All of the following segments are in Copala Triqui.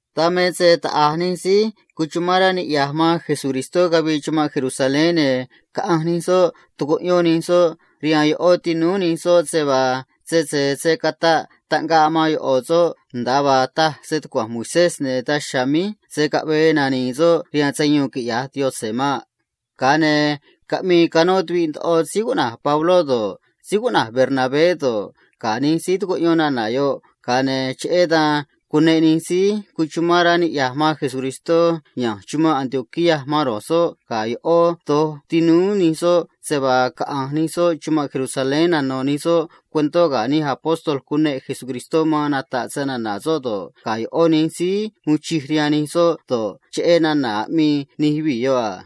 Dan me se taꞌa̱j nij síí noco̱ꞌ man Jesucristó cavii estadó Judea, ne̱ caꞌanj nij soꞌ tucuꞌyón nij soꞌ rihaan ꞌó tinúú nij soꞌ se vaa sese se̱ cataꞌ taꞌngaꞌ man ꞌo̱ soꞌ nda̱a vaa taj stucua̱nj Moisés, ne̱ daj chiha̱a̱ míj se̱ caꞌvee nani̱i̱ soꞌ rihaan sayuun ne̱ cavi̱i̱ sa̱ꞌ soꞌ quiꞌya̱j Yaꞌanj maꞌ. Caꞌmii canó tuviꞌ ndoꞌo síí cuꞌna̱j Pabló do̱ꞌ, síí cuꞌna̱j Bernabé do̱ꞌ, ga̱ nij síí tucuꞌyón nana̱ yoꞌ a. Ga̱a ne̱ cheꞌé dan cuneꞌ nij síí noco̱ꞌ man Jesucristó ya̱nj chumanꞌ Antioquía man ro̱j soꞌ ga̱ ꞌó do̱j tinúú nij soꞌ se vaa caꞌa̱nj nij soꞌ chumanꞌ Jerusalén caꞌmi̱i̱ nij soꞌ ga̱ nij síí ata̱ suun caꞌa̱nj nata̱ꞌ snana̱ Jesucristó do̱ꞌ, ga̱ ꞌó nij síí tumé sa̱ꞌ rihaan Yaꞌanj man nij síí noco̱ꞌ man Cristó do̱ꞌ, cheꞌé nana̱ aꞌmii nij yuvii̱ yoꞌ a.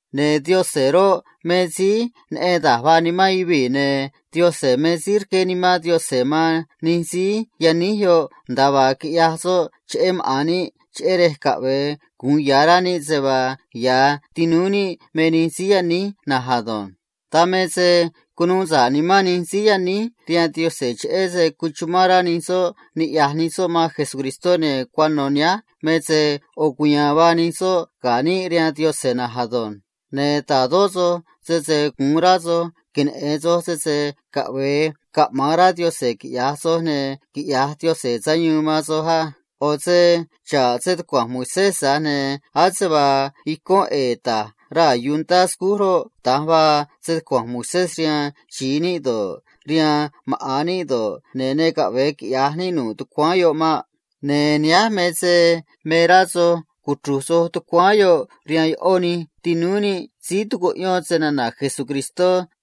Ne̱ Yaꞌanj roꞌ, me síí neꞌen da̱j vaa nimán yuvii̱, ne̱ Yaꞌanj me síí rqué Nimán Yaꞌanj man nij síí yaníj yoꞌ nda̱a vaa quiꞌyaj soꞌ cheꞌé maꞌa̱n níꞌ, cheꞌé rej caꞌve̱e gu̱un ya̱ rá níꞌ se vaa ya̱ tinúú níꞌ me nij síí yaníj na̱nj ado̱nj. Dan me se cunuu sa̱ꞌ nimán nij síí yaníj rihaan Yaꞌanj cheꞌé se cuchumán rá nij soꞌ niꞌya̱j nij soꞌ man Jesucristó, ne̱ cuano̱ nihánj me se ꞌo̱ cuya̱a̱n vaa nij soꞌ ga̱ níꞌ rihaan Yaꞌanj na̱nj ado̱nj. ’Ne̱ ta̱dó soj sese gu̱un rá soj queneꞌe̱n soj sese caꞌve̱e caꞌma̱an rá Yaꞌanj quiꞌya̱j soj ne̱ quiꞌya̱j Yaꞌanj sayuun man soj á. ꞌO̱ se xa̱ꞌ stucua̱nj Moisés, tza̱j ne̱ ase vaa icón ꞌe̱e̱ ta̱j raa̱ yuntá scúj roꞌ, da̱nj vaa stucua̱nj Moisés rihaan xi̱i níꞌ do̱ꞌ, rihaan maꞌa̱n níꞌ do̱ꞌ, ne̱ ne caꞌve̱e quiꞌya̱j níꞌ nu̱ꞌ tucuáán yoꞌ maꞌ. Ne̱ nihánj me se me rá soj cuchru̱j soj tucuáán yoꞌ rihaan ꞌó nij tinúú níꞌ síí tucuꞌyón snana̱ Jesucristó asânj.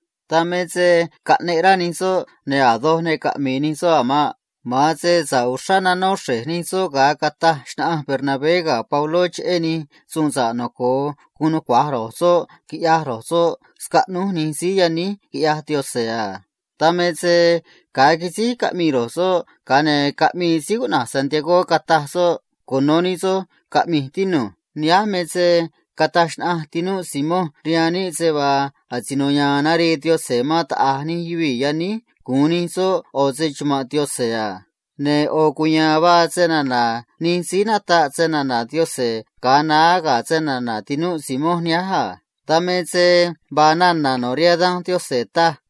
Dan me se caꞌneꞌ rá cunuda̱nj nij soꞌ, ne̱ a̱ doj ne caꞌmi̱i̱ nij soꞌ a̱ maꞌ. Ma̱an se sa̱ꞌ uxrá nanó xre̱j nij soꞌ ga̱a cataj xnaꞌanj Bernabé ga̱ Pabló cheꞌé da̱j a̱ nij suun sa̱ꞌ noco̱o guun nucua̱j ro̱j soꞌ quiꞌyaj ro̱j soꞌ scaꞌnúj nij síí yaníj quiꞌyaj Yaꞌanj a. Dan me se ga̱a quisíj caꞌmii ro̱j soꞌ, ga̱a ne̱ caꞌmii síí cuꞌna̱j Jacobo, cataj soꞌ a: ―Cuno̱ nij soj caꞌmi̱j, tinu̱j: Nihánj me se cataj xnaꞌanj tinúꞌ Simón rihaan níꞌ se vaa asino ya̱a̱n narii Yaꞌanj man taꞌa̱j nij yuvii̱ yaníj gu̱un nij soꞌ ꞌo̱ se‑chuma̱nꞌ Yaꞌanj a. Ne̱ ꞌo̱ cuya̱a̱n vaa snana̱ nij síí nataꞌ snana̱ Yaꞌanj ga̱a naá ga̱ snana̱ tinúꞌ Simón nihánj a. Dan me se vaa nana̱ no̱ rihaan Danj Yaꞌanj taj a: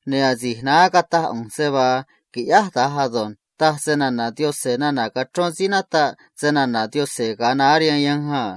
ne̱ asi̱j naá cataj ꞌu̱nj se vaa qui̱ꞌyáj da̱nj ado̱nj, taj snana̱ Yaꞌanj nana̱ cachrón síí nataꞌ snana̱ Yaꞌanj ga̱a naá rihaan yanj a.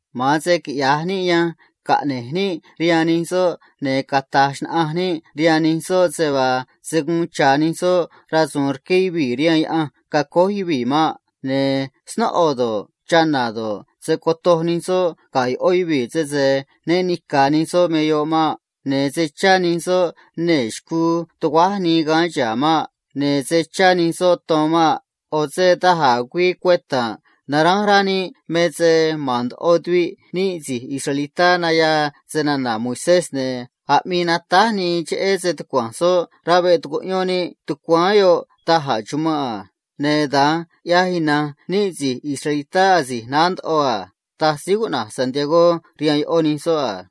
Ma̱an se quiꞌya̱j níꞌ yanj caꞌne̱j níꞌ rihaan nij soꞌ, ne̱ cata̱j xnaꞌanj níꞌ rihaan nij soꞌ se vaa se̱ guun cha̱ nij soꞌ rasu̱u̱n rqué yuvii̱ rihaan yaꞌanj quiꞌyaj maꞌa̱n yuvii̱ maꞌ. Ne̱ snóꞌo do̱ꞌ, chana̱ do̱ꞌ, se̱ cotoj nij soꞌ ga̱ ꞌó yuvii̱ sese né ni̱ca̱ nij soꞌ me yoꞌ maꞌ. Ne̱ se̱ chá nij soꞌ nee̱ xcuu tuguáj nii gaán chihá maꞌ. Ne̱ se̱ chá nij soꞌ ton maꞌ. ꞌO̱ se da̱j a̱ güii cueta̱nꞌ naránj rá níꞌ me se ma̱n ndoꞌo tuviꞌ níꞌ si̱j israelitá nayaa snana̱ Moisés, ne̱ aꞌmii natáj nii cheꞌé stucua̱nj soꞌ rá veꞌ tucuꞌyón níꞌ tucuáán yoꞌ da̱j a̱ chumanꞌ a. Ne̱ da̱nj ꞌyaj ina̱nj níꞌ si̱j israelitá asi̱j naá ndoꞌo a ―taj Jacobo rihaan ꞌó nij soꞌ a.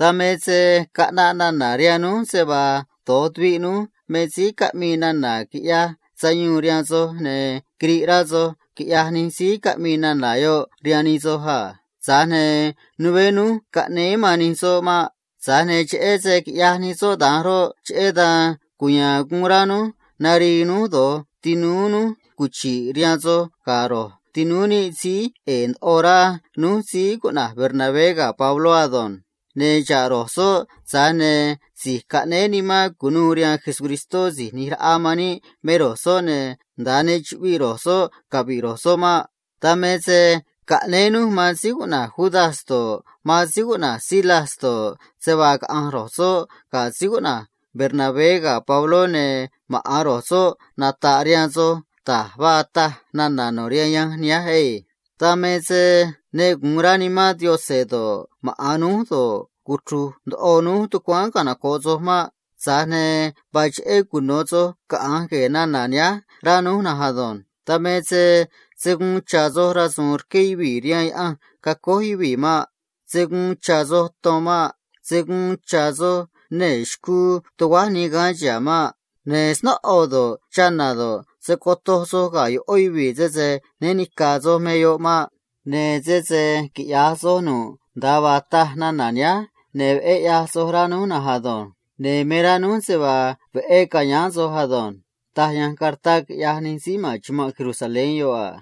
Dan me se caꞌnaꞌ nana̱ rihaan núj se vaa do̱j tuviꞌ núj me síí caꞌmii nana̱ quiꞌyaj sayuun rihaan soj, ne̱ quiriꞌ rá nimán soj, quiꞌyaj nij síí caꞌmii nana̱ yoꞌ a. Tza̱j ne̱ né núj caꞌnéé man nij soꞌ maꞌ. Tza̱j ne̱ cheꞌé se quiꞌyaj nij soꞌ da̱nj roꞌ, cheꞌé dan cuya̱a̱n guun rá núj nari̱i̱ núj do̱j tinúú núj cuchi̱ꞌ rihaan soj ga̱ ro̱j tinúú níꞌ síí ꞌe̱e̱ ndoꞌo rá núj síí cuꞌna̱j Bernabé ga̱ Pabló ado̱nj. Ne̱ xa̱ꞌ ro̱j soꞌ, tza̱j ne̱ si̱j caꞌnéé nimán cu̱nuû rihaan Jesucristó Si̱j ꞌNi̱j Raꞌa man níꞌ me ro̱j soꞌ, ne̱ nda̱a ne chuꞌviꞌ ro̱j soꞌ cavi̱ꞌ ro̱j soꞌ maꞌ. Dan me se caꞌnéé núj man síí cuꞌna̱j Judas do̱ꞌ, Silas do̱ꞌ, se vaa caꞌa̱nj ro̱j soꞌ ga̱ Bernabé ga̱ Pabló, ne̱ maꞌa̱n ro̱j soꞌ nata̱ꞌ rihaan soj nda̱a vaa taj nana̱ no̱ rihaan yanj nihánj na̱nj á. ’Dan me se ne gu̱un rá Nimán Yaꞌanj do̱ꞌ, maꞌa̱n núj do̱ꞌ, cuchru̱j ndoꞌo núj tucuáán canoco̱ꞌ soj maꞌ. Tza̱j ne̱ vaa cheꞌé cuno̱ soj caꞌa̱nj gue̱e̱ nana̱ nihánj, rá núj na̱nj ado̱nj. Dan me se se̱ guun cha̱ soj rasu̱u̱n rqué yuvii̱ rihaan yaꞌanj quiꞌyaj maꞌa̱n yuvii̱ maꞌ. Se̱ guun cha̱ soj ton maꞌ. Se̱ guun cha̱ soj nee̱ xcuu tuguáj nii gaán chihá maꞌ. Ne̱ snóꞌo do̱ꞌ, chana̱ do̱ꞌ, se̱ cotoj soj ga̱ ꞌó yuvii̱ sese né ni̱ca̱ soj me yoꞌ maꞌ. Ne̱ sese quiꞌya̱j soj nu̱ꞌ nda̱a vaa taj nana̱ nihánj, ne̱ veꞌé ꞌyaj soj, rá núj na̱nj ado̱nj. Ne̱ me rá núj se vaa veꞌé ca̱yáán soj ado̱nj.” Da̱nj taj yanj cartá quiꞌyaj nij síí ma̱n chumanꞌ Jerusalén yoꞌ a.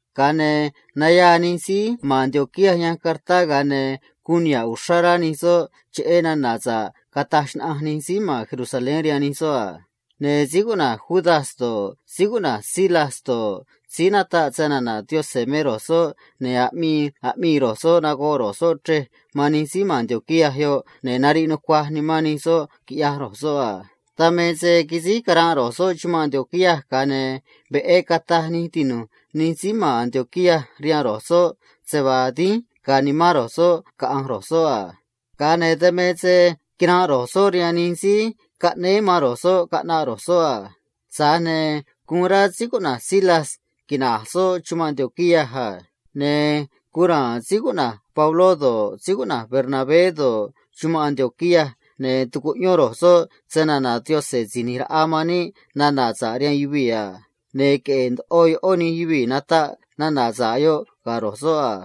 Ga̱a ne̱ nayaa nij síí ma̱n Antioquía yanj cartá, ga̱a ne̱ guun niha̱ꞌ uxrá rá nimán nij soꞌ cheꞌé nana̱ sa̱ꞌ cataj xnaꞌanj nij síí ma̱n Jerusalén rihaan nij soꞌ a. Ne̱ Judas do̱ꞌ, Silas do̱ꞌ roꞌ, síí nataꞌ snana̱ Yaꞌanj me ro̱j soꞌ, ne̱ aꞌmii aꞌmii ro̱j soꞌ nagoꞌ ro̱j soꞌ chrej man nij síí ma̱n Antioquía yoꞌ, ne̱ nariꞌ nucuaj nimán nij soꞌ, quiꞌyaj ro̱j soꞌ a. Dan me se quisíj caranꞌ ro̱j soꞌ chumanꞌ Antioquía, ga̱a ne̱ veꞌé cataj nij tinu̱j nij síí ma̱n Antioquía rihaan ro̱j soꞌ se vaa dínj ga̱a̱ nimán ro̱j soꞌ caꞌa̱nj ro̱j soꞌ a. Ga̱a ne̱ quinanꞌ ro̱j soꞌ rihaan nij síí caꞌnéé man ro̱j soꞌ caꞌnaꞌ ro̱j soꞌ a. Tza̱j ne̱ guun rá Silas quina̱j soꞌ chumanꞌ Antioquía a. Ne̱ guun ra̱a̱n Pabló do̱ꞌ, Bernabé do̱ꞌ, chumanꞌ Antioquía, ne̱ tucuꞌyón ro̱j soꞌ snana̱ Síí ꞌNi̱j Raꞌa man níꞌ nana̱ sa̱ꞌ rihaan yuvii̱ a. Ne̱ queꞌe̱e̱ ndoꞌo ꞌó nij yuvii̱ nataꞌ nana̱ sa̱ꞌ yoꞌ ga̱ ro̱j soꞌ a.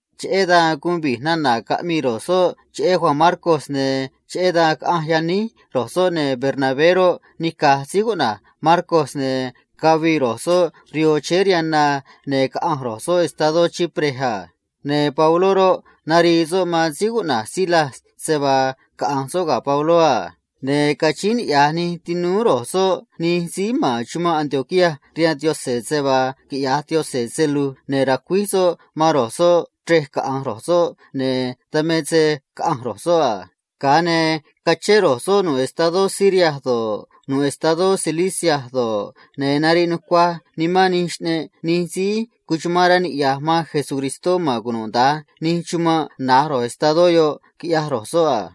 Cheꞌé dan guun vi̱j nana̱ caꞌmii ro̱j soꞌ, ne̱ cheꞌé dan caꞌanj yaníj ro̱j soꞌ, ne̱ Bernabé roꞌ, nica̱j Marcos, ne̱ cavii ro̱j soꞌ rihoo chéé rihaan na, ne̱ caꞌanj ro̱j soꞌ estadó Chipre a. Ne̱ Pabló roꞌ, narii soꞌ man síí cuꞌna̱j Silas se vaa caꞌa̱nj soꞌ ga̱ Pabló a. Ne̱ cachíín niꞌya̱j nij tinúú ro̱j soꞌ nij síí ma̱n chumanꞌ Antioquía rihaan Yaꞌanj se vaa quiꞌya̱j Yaꞌanj se lu̱j ne̱ ra̱cuíj soꞌ man ro̱j soꞌ chrej caꞌa̱nj ro̱j soꞌ, ne̱ dan me se caꞌanj ro̱j soꞌ a. Ga̱a ne̱ cachén ro̱j soꞌ nu̱ꞌ estadó Siria do̱ꞌ, nu̱ꞌ estadó Cilicia do̱ꞌ, ne̱ nariꞌ nucuaj nimán nij xꞌneꞌ nij síí noco̱ꞌ man Jesucristó ma̱n cunuda̱nj nij chumanꞌ na̱j ro̱j estadó yoꞌ, quiꞌyaj ro̱j soꞌ a.